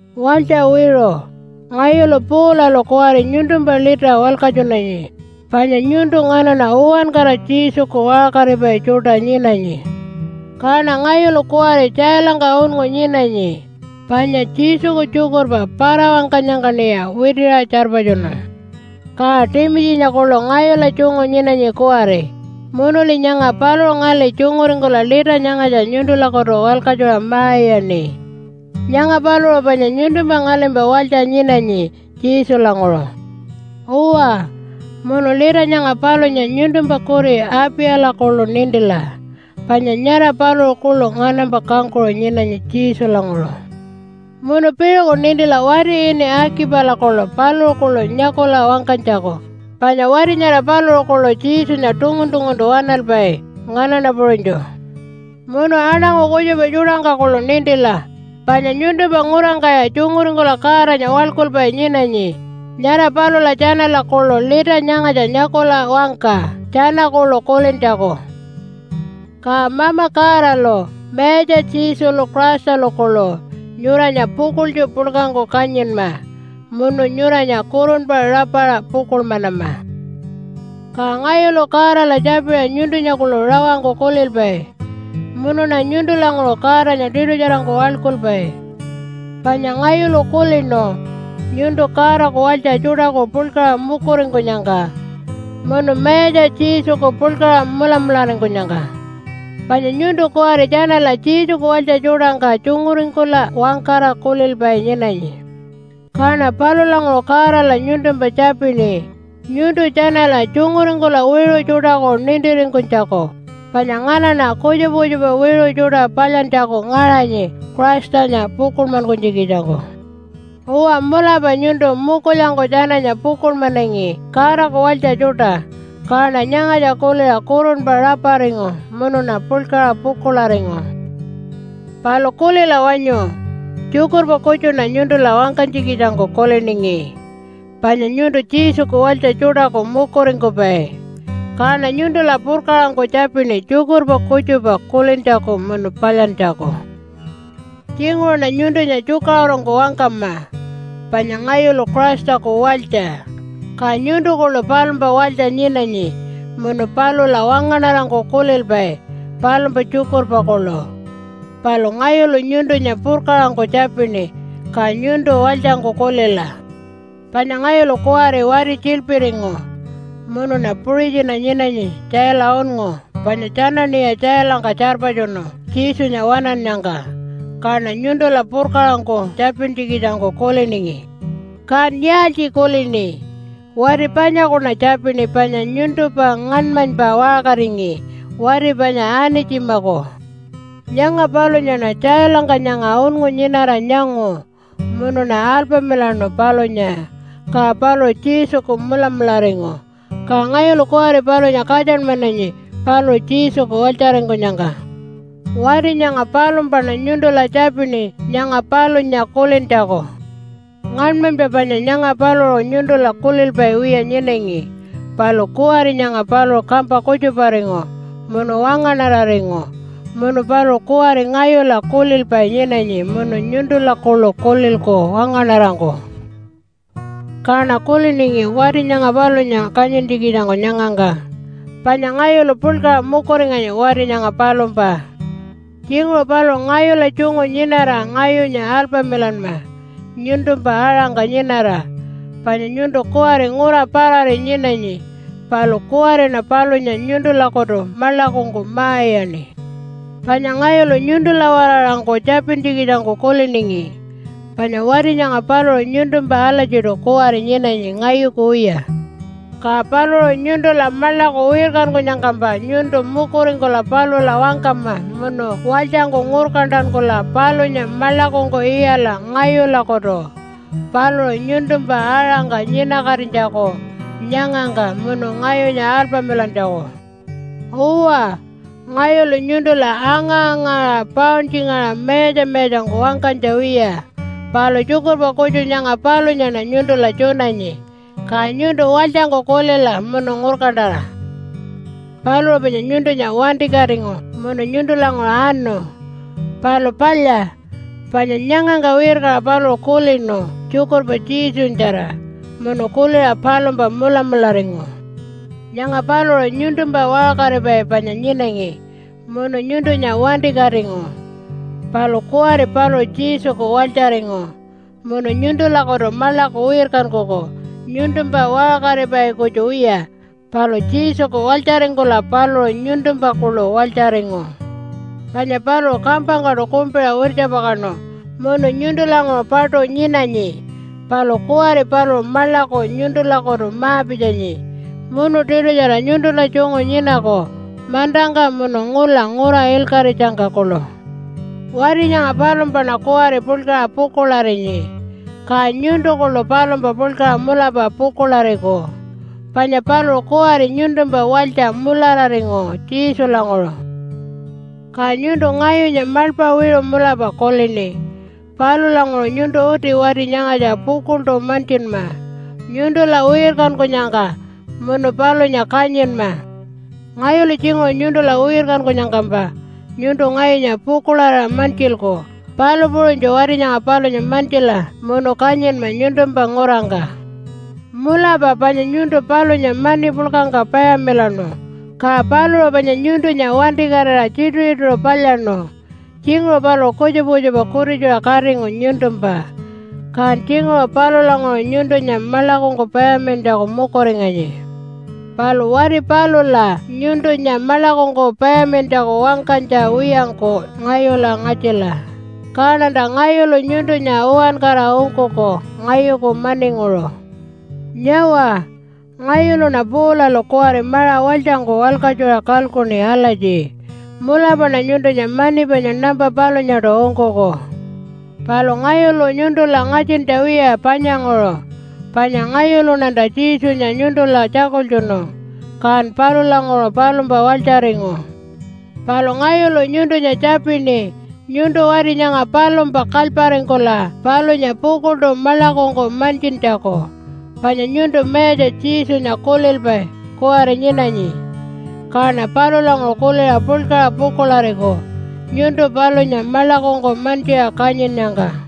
Walytja wiṟu! Ngayulu Paulalu kuwari nyuntumpa lita walkatjunanyi, panya nyuntu nganaṉa uwankara Jesuku waṟkaripai tjuṯa nyinanyi. Kaṉa ngayulu kuwari tjailangka unngu nyinanyi panya Jesuku tjukurpa para-wangkanyangkaṉiya witiṟa tjarpatjunu. Ka Timitjinya kuḻu ngayula tjungu nyinanyi kuwari, munuli nyanga paluṟu ngali tjunguringkula lita nyangatja nyuntulakutu walkatjuṟa ma-iyaṉi. Nyanga paluṟu panya nyuntumpa ngalimpa walytja nyinanyi Jesulanguṟu. Uwa, munu lita nyanga palunya nyuntumpa kuri Apiyala kuḻu nintila, panya nyara paluṟu kuḻu nganampa kangkuṟu nyinanyi Jesulanguṟu. Munu piṟuku nintila wati ini Akipala kuḻu paluṟu kuḻu nyakula wangkanytjaku, panya wati nyara paluṟu kuḻu Jesunya tungun-tunguntu waṉalpai nganaṉa puṟunytju. Munu aṉangu kutjupa tjuṯangka kuḻu nintila panya nyuntumpa ngurangkaya tjunguringkula Godanya waḻkulpai nyinanyi, nyara palula tjanala kuḻu lita nyangatja nyakula wangka tjana kuḻu kulintjaku. Ka Mama Godalu Mayatja Jesulu Christalu kuḻu nyuranya pukuḻtju puḻkangku kanyinma munu nyuranya kurunpa rapaṟa pukuḻmanama. Ka ngayulu Godala tjapiṟa nyuntunya kuḻu rawangku kulilpai munuṉa nyuntulanguṟu Godanya tiṯutjarangku waḻkulpai, panya ngayulu kulinu nyuntu Godaku walytja tjuṯaku puḻkaṟa mukuringkunyangka, munu Mayatja Jesuku puḻkaṟa mulamularingkunyangka. Panya nyuntu kuwari tjanala Jesuku walytja tjuṯangka tjunguringkula wangkara kulilpai nyinanyi. Kaṉa palulanguṟu Godala nyuntumpa tjapini, nyuntu tjanala tjunguringkula wiṟu tjuṯaku nintiringkunytjaku, panya nganaṉa kutjupa kutjupa wiṟu tjuṯa palyantjaku ngaṟanyi Christanya pukuḻmankunytjikitjangku. Uwa mulapa nyuntu mukulyangku tjananya pukuḻmanangi Godaku walytja tjuṯa, kaṉa nyangatja kuliṟa kurunpa raparingu munuṉa puḻkaṟa pukuḻaringu. Palu kulila wanyu! Tjukurpa kutjuṉa nyuntula wangkanytjikitjangku kuliningi, panya nyuntu Jesuku walytja tjuṯaku mukuringkupai. Kaṉa nyuntula purkaṟangku tjapini tjukurpa kutjupa kulintjaku munu palyantjaku. Tjinguṟuṉa nyuntunya tjukaṟurungku wangkama, panya ngayulu Christaku walytja, ka nyuntu kuḻu palumpa walytja nyinanyi munu palula wangaṉarangku kulilpai palumpa tjukurpa kuḻu. Palu ngayulu nyuntunya purkaṟangku tjapini ka nyuntu walytjangku kulila. Panya ngayulu kuwari wati tjiḻpiringu, munuṉa puṟitjina nyinanyi tjaila unngu panya tjanaṉiya tjailangka tjarpatjunu Jesunya waṉannyangka. Kaṉa nyuntula purkaṟangku tjapintjikitjangku kuliningi. Kan yaaltji kulini? Wati panyakuṉa tjapini panya nyuntumpa ngaṉmanypa waṟkaringi, wati panya Anitjimaku. Nyanga palunyaṉa tjailangka nyanga unngu nyinara nyangu, munuṉa alpamilaṉu palunya, ka paluṟu Jesuku mulamularingu, ka ngayulu kuwari palunya katjanmananyi paluṟu Jesuku walytjaringkunyangka. Wati nyanga palumpaṉa nyuntula tjapini nyanga palunya kulintjaku. Ngaṉmanypa panya nyanga paluṟu nyuntula kulilpai wiya nyinangi, palu kuwari nyanga paluṟu kampa kutjuparingu munu wangaṉararingu. Munu paluṟu kuwari ngayula kulilpai nyinanyi munu nyuntula kuḻu kulilku wangaṉarangku. Kaṉa kuliningi wati nyanga palunya kanyintjikitjangku nyangangka. Panya ngayulu puḻkaṟa mukuringanyi wati nyanga palumpa. Tjinguṟu paluṟu ngayula tjungu nyinara ngayunya alpamilanma nyuntumpa aṟangka nyinara, panya nyuntu kuwari ngura parari nyinanyi. Palu kuwariṉa palunya nyuntulakutu maḻakungku ma-iyaṉi. Panya ngayulu nyuntula-waraṟangku tjapintjikitjangku kuliningi, panya wati nyanga paluṟu nyuntumpa alatjiṯu kuwari nyinanyi ngayuku wiya. Ka paluṟu nyuntula maḻaku wirkankunyangkampa nyuntu mukuringkula palula wangkama munu walytjangku ngurkantankula palunya maḻakungku iyala ngayulakutu paluṟu nyuntumpa aṟangka nyinakatinytjaku nyangangka munu ngayunya alpamilantjaku. Uwa, ngayulu nyuntula anga-angaṟa pauntjingaṟa mayatja-mayatjangku wangkanytja wiya. Palu tjukurpa kutju nyanga palunyaṉa nyuntula tjunanyi, ka nyuntu walytjangku kulila munu ngurkantara. Paluṟu panya nyuntunya wantikatingu munu nyuntulanguṟu anu. Palu palya, panya nyangangka wirkaṟa paluṟu kulinu tjukurpa Jesunyatjara munu kuliṟa palumpa mulamularingu. Nyanga paluṟu nyuntumpa waṟkaripai panya nyinangi munu nyuntunya wantikatingu, palu kuwari paluṟu Jesuku walytjaringu munu nyuntulakutu maḻaku wirkankuku nyuntumpa waṟkaripai kutju wiya palu Jesuku walytjaringkula paluṟu nyuntumpa kuḻu walytjaringu. Panya paluṟu kampangkaṯu kumpiṟa wirtjapakaṉu munu nyuntulanguṟu paṯu nyinanyi, palu kuwari paluṟu maḻaku nyuntulakutu ma-pitjanyi munu tiṯutjara nyuntula tjungu nyinaku mantangka munu ngula ngura ilkaṟitjangka kuḻu. Wati nyanga palumpaṉa kuwari puḻkaṟa pukuḻarinyi, ka nyuntu kuḻu palumpa puḻkaṟa mulapa pukuḻariku panya paluṟu kuwari nyuntumpa walytja mulararingu Jesulanguṟu. Ka nyuntu ngayunya maḻpa wiṟu mulapa kulini. Palulanguṟu nyuntu uti wati nyangatja pukuḻṯu mantjinma nyuntula wirkankunyangka munu palunya kanyinma. Ngayulu tjinguṟu nyuntula wirkankunyangkampa nyuntu ngayunya pukuḻarira mantjilku, palu puṟunytju wati nyanga palunya mantjila munu kanyinma nyuntumpa ngurangka. Mulapa panya nyuntun palunya mani puḻkangka payamilaṉu, ka paluṟu panya nyuntunya wantikatira tjituṟu-tjituṟu palyaṉu. Tjinguṟu paluṟu kutjupa kutjupa kutitjuṟa katingu nyuntumpa, kan tjinguṟu palulanguṟu nyuntunya maḻakungku payamilantjaku mukuringanyi. Palu wati palula nyuntunya maḻakungku payamilantjaku wangkanytja wiyangku ngayula ngatjila, kaṉanta ngayulu nyuntunya uwankara ungkuku, ngayuku maninguṟu. Nyawa, ngayuluṉa Paulalu kuwari maṟa walytjangku walkatjuṟa kalkuṉi alatji, “Mulapaṉa nyuntunya mani panya nampa palunyaṯu ungkuku.” Palu ngayulu nyuntula ngatjintja wiya panyanguṟu, panya ngayuluṉanta Jesunya nyuntula tjakultjunu, kan palulanguṟu palumpa walytjaringu. Palu ngayulu nyuntunya tjapini nyuntu wati nyanga palumpa kalyparingkula palunya pukuḻṯu maḻakungku mantjintjaku, panya nyuntu Mayatja Jesunya kulilpai kuwari nyinanyi. Kaṉa palulanguṟu kuliṟa puḻkaṟa pukuḻariku nyuntu palunya maḻakungku mantjiṟa kanyinnyangka.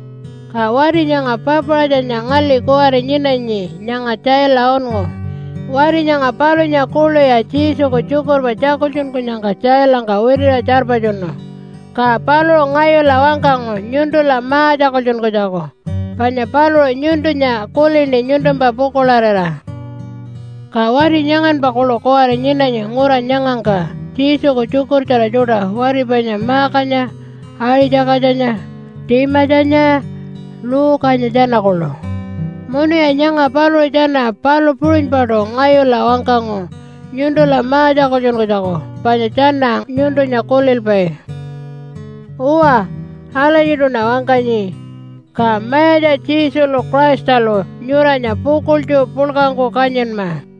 Ka wati nyanga Papaṟatjanya ngali kuwari nyinanyi nyanga tjaila unngu. Wati nyanga palunya kuḻuya Jesuku tjukurpa tjakultjunkunyangka tjailangka witiṟa tjarpatjunu. Ka paluṟu ngayula wangkangu nyuntula ma-tjakultjunkunytjaku panya paluṟu nyuntunya kulini nyuntumpa pukuḻarira. Ka wati nyanganpa kuḻu kuwari nyinanyi ngura nyangangka Jesuku tjukurtjara tjuṯa wati panya Markanya, Aṟi-tjakatjanya, Timatjanya, Luke-anya tjana kuḻu. Munuya nyanga paluṟu tjana palu puṟunypaṯu ngayula wangkangu nyuntula ma-tjakultjunkunytjaku panya tjana nyuntunya kulilpai. Uwa alatjiṯuṉa wangkanyi. Ka Mayatja Jesulu Christalu nyuranya pukuḻtju puḻkangku kanyinma.